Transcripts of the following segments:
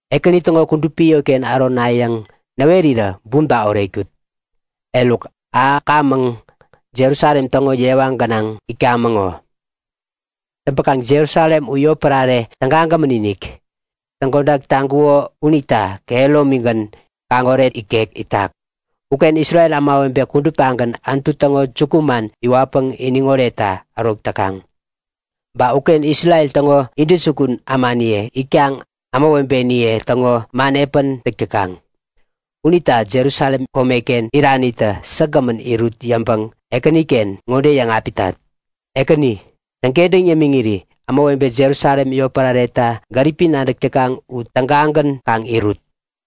Ekäni täŋo kudupi yotken ärona yäŋ näwerirä bumta oretkut! Eruk, ahäkamäŋ, Jerusalem täŋo yewa gänaŋ itkamäŋ ŋo. Täŋpäkaŋ Jerusalem u yotpärare tägagämän-inik. Täŋkodak taŋkuŋo unita kehäromigän, kaŋoret ikek itak. Uken Isrel ämawebe kuduptagän Anutu täŋo jukuman iwatpäŋ iniŋ oretta ärok täkaŋ. Ba uken Isrel täŋo intäjukun ämaniye itkaŋ ämawebeniye täŋo man epän täk täkaŋ. Unita Jerusalem komeken iranitä säkgämän irut yäŋpäŋ Ekäniken ŋode yäŋapitat; Ekäni, täŋkentäŋ yämiŋiri ämawebe Jerusalem yotpärareta gäripi nadäk täkaŋ u tägagän kaŋ irut!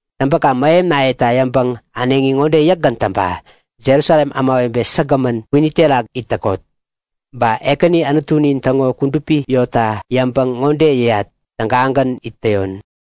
Täŋpäkaŋ mähemnayeta yäŋpäŋ äneŋi ŋode yäkgän täŋpa; Jerusalem ämawebe säkgämän, kwini terak it täkot! Ba Ekäni Anutunin täŋo kudupi yotta yäŋpäŋ ŋode yäyat; Tägagän it täyon.